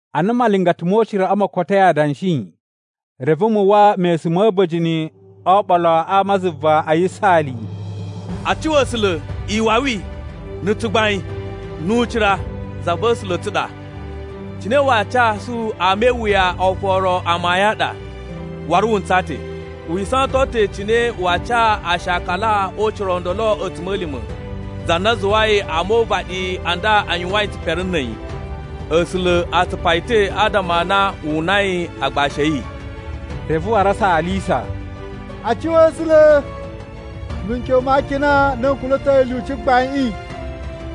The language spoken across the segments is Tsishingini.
Ana malingata mo uciraꞌa mo kotoi adanshi, reve mu uwwa mesun ma̱ a̱ba̱jini o oɓolo a ama zuva a yisaali: “A cuwa A̱sula̱! Iwawi, na̱ tsugbain, nu ucira za va̱ A̱sula̱ a̱ tsu a ɗa! Cine waa casu ama e iwuya oforo amayun a ɗa waru wu ntsaa ta̱. Wi isawaton ta̱ cine waa ca aashakala o ucira o ndolo a̱tsuma̱lima̱, za na zuwai ama o uvaɗi a nda a yuwain tsipere na̱ a̱yi. A̱sula̱ a tsupa yi ta̱ adama a na wu unai agbashi a̱ yi.” Reve waru a saalisa: “A cuwa A̱sula̱! Mikyon ma akina n na n kula̱toi lyuci gbaiꞌin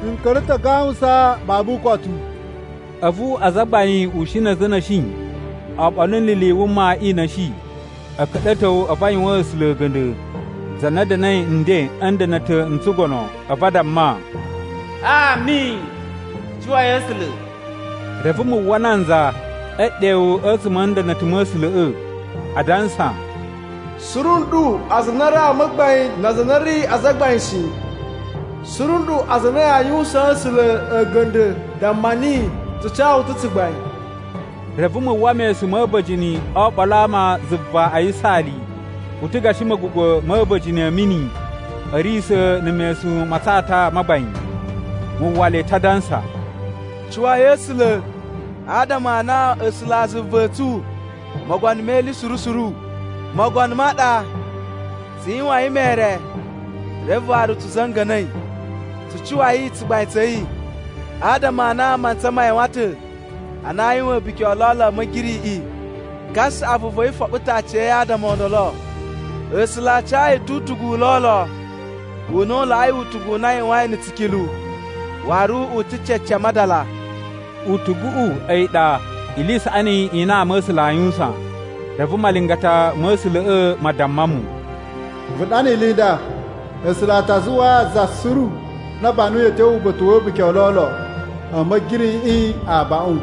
n ka̱ra̱ ta̱ a gawusan babu ukotu!” A̱vu azagbain ushin na̱ a̱za̱ a̱ na̱shi oɓolo ni ili i wuma i na̱shi a̱ ka̱ɗa̱to a̱vu a yuwaan A̱sula̱ a̱ga̱nda̱, za na da̱na̱i nden a̱ nda̱na̱ta̱ n tsugono. A̱vu a damma, “Ami! Tsu cuwai A̱sula̱!” Reve mu uwwa nanza e ɗewu a̱tsuma̱ a̱ nda̱na̱ta̱ ma̱ A̱sula̱ꞌa̱, adansa: “Suru nɗu aza a na a̱ ri ama a gbain na aza a na a̱ ri azagbain shi, suru nɗu aza a na aa yuwusaan A̱sula̱ a̱ga̱nda̱ damma niyi, ‘Tsu ca wu ta̱ tsugbain.’” Reve mu uwwa mesun ma̱ a̱ba̱jini o oɓolo a ama zuva a yisaali. U ta̱ gashi ma̱gugwa̱ ma̱ a̱ba̱jini a̱ mini a̱ riyisa̱ na̱ mesun ma tsata ma gbain. Mu uwwa le ta̱ adansa: “Cuwai A̱sula̱! Adama a na A̱sulazuva a̱ tsu, Mogono me ili suru suru, Mogono ma ɗa! Tsu yuwain mere reve waru tsu za̱nga̱na̱i. Tsu cuwai tsugbain tsa̱ yi! Adama a na mantsa ma yuwan ta̱ ana aa yuwan a̱buki o lolo a̱ Ma̱giriꞌiꞌi. Kasaꞌavu va̱ yi foɓo ta̱ aciya̱yi adama o ndolo. A̱sula̱ a ca yi ta̱ utugu u lolo, u na u laꞌai utugu u na a yuwain na̱ tsikilu, waru u ta̱ cece a madala.” (Utuguꞌu a̱yi ɗa ili i saꞌani i na ama a̱ A̱sula̱ aa yuwusan.) Reve malingata ma̱ A̱sula̱ꞌa̱ ma damma mu, “Vu ɗana ili i nda: A̱sula̱ a ta zuwaa za suru na a banuyi a̱ tyo uba̱ta̱ wa̱ a̱buki o lolo a̱ Ma̱giriꞌiꞌi abaꞌun.”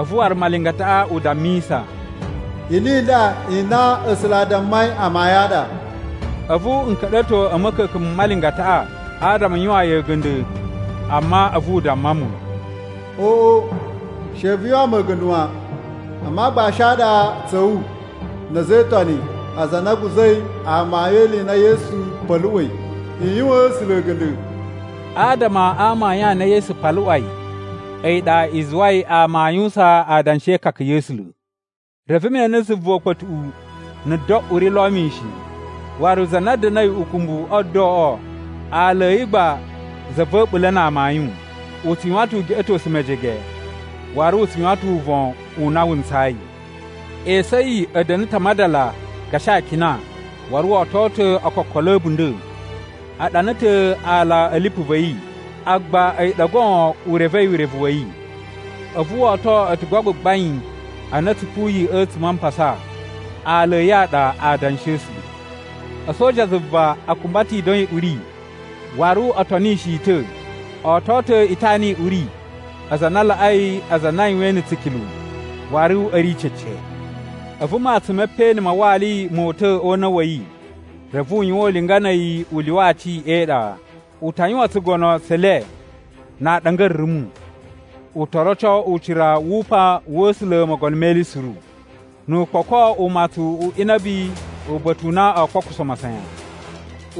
A̱vu waru malingataꞌa u dammisa, “Ili i nda i na A̱sula̱ a dammai amayun a ɗa.” A̱vu n ka̱ɗa̱to a̱ ma̱ka̱ka̱n ma malingataꞌa adama n yuwaan yi a̱ga̱nda̱, amma a̱vu u damma mu, “Oꞌo, she vu yuwaan mu a̱ga̱nda̱ wan! A̱mu aagbashi a ɗa tsa̱ wu na̱ a̱za̱ e Itoni, aza a na a̱ guza̱i amayun e ili i na Yesu paluꞌwai. I yuwaan A̱sula̱ a̱ga̱nda̱!” Adama a amayun a na Yesu paluꞌwai a̱yi ɗa i zuwai ama aa yuwusan adanshi e ikaka ya̱ A̱sula̱. Reve me ene zuva ukpa̱tuꞌu, na̱ do uri lo mishin. Waru za na da̱na̱i ukumbu o doꞌo aala a̱ yi gba Za va̱ A̱ɓula̱ na Amayun. U tsu yuwan ta̱ ugeꞌetosu mejege waru u tsu yuwan ta̱ uvon u na wu ntsayi. Esu a̱ yi a̱ da̱na̱ ta̱ a madala gashi akina, waru wo oto ta̱ okokolo a̱ a̱bunda̱. A ɗana ta̱ aala a̱ lipu va̱ yi, agba a̱yi ɗa goon u revei urevu wa̱ yi. A̱vu wo oto a̱tugu a gbagbain a na a̱ tsupuyi a̱tsuma̱ a mpasa. Aala a̱ yi a ɗa “Aadanshi a̱ A̱sula̱.” A̱soja a zuva a kumba ta̱ ido i uri waru o tonishi yi ta̱. O oto ta̱ itana i uri, aza a na a laꞌai aza a na a yuwain na̱ tsikilu, waru a̱ ri cece. A̱vu matsun me peꞌeni ma wali mo uta̱ o una̱ wa̱ yi, reve u yuwan ulinga na̱ a̱yi u lyuwa aci e iɗa. U ta yuwan tsugono tse le na aaɗanga a̱ rumu. U to roco ucira wu upan wa̱ A̱sula̱ Mogono me Ili Suru, nu u kpoko umatsun u inabi uba̱ta̱ u na o kpokuso masayan.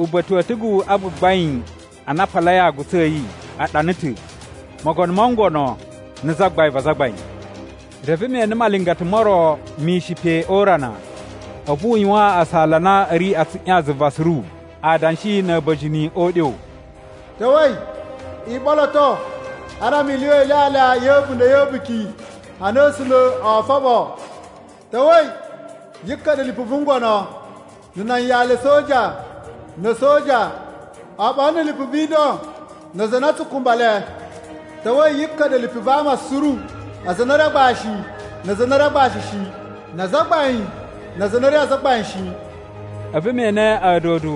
Uba̱ta̱ wa̱ a̱tugu a gbagbain a na a palai aagutsu a̱ yi, a ɗana ta̱: MOGONO MO NGONO NA̱ ZAGBAIN VA AZAGBAIN. Reve me ene malingata mo ro mishin pe o urana. A̱vu u yuwaan asala a na a̱ ri a tsuꞌyan zuva suru adanshi na̱ a̱ba̱jini o uɗyo: “Ta̱wa̱i! I ɓoloto adama i lyuwa ilyalya ya̱ a̱bunda̱ ya̱ a̱buki a na A̱sula̱ oo foɓo! Ta̱wa̱i! Yi ka̱ɗa̱ lipu vu ngono, na̱ nan yali a̱ a̱soja, na̱ a̱soja, oɓolo na̱ lipu vi ido na aza a na a tsu kumba le. Ta̱wa̱i! Yi ka̱ɗa̱ lipu va ama suru: aza a na a̱ ri agbashi na aza a na a̱ ri agbashi shi, na azagbain, na aza a na a̱ ri azagbain shi!” A̱vu me ene a̱a̱dodo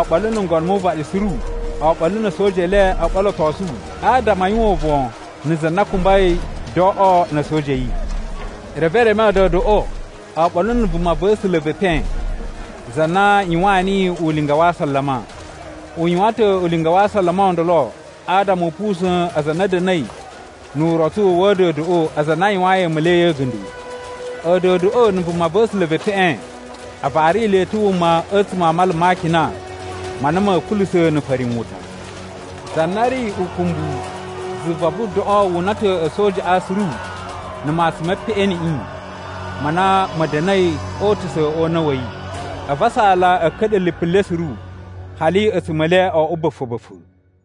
oɓolo na̱ ngono mu uvaɗi suru, oɓolo na̱ a̱soja e le o ɓolotosu adama a yuwan uvon na̱ za na kumbai doꞌo na̱ a̱soja a̱ yi. Reve e reme a̱a̱dodoꞌo, oɓolo na̱ vumava̱sula̱ ve epen za na yuwaan niyi ulinga wa asalama. (U yuwan ta̱ ulinga wa asalama o ndolo adama u pusa̱n aza a na a̱ da̱na̱i nu urotsu wa̱ a̱a̱dodoꞌo aza a na a yuwayin a̱a̱ma̱li a̱ yi a̱ga̱nda̱.) A̱a̱dodoꞌo na̱ vumava̱sula̱ ve epeꞌen a vari le ta̱ wuma a̱tsuma̱ a mala ma akina ma na ma̱a̱ kulusa̱ na̱ farinwuta. Za na ri ukumbu zuva vu doꞌo wu una ta̱ a̱sojaꞌa suru na̱ matsun me peꞌeniꞌi ma na ma̱ da̱na̱i o utusa̱ o una̱ wa̱ yi. A̱vu asala a̱ ka̱ɗa̱ lipu le suru hali a̱tsuma̱ e le o oꞌwo ba̱fa̱-ba̱fa̱.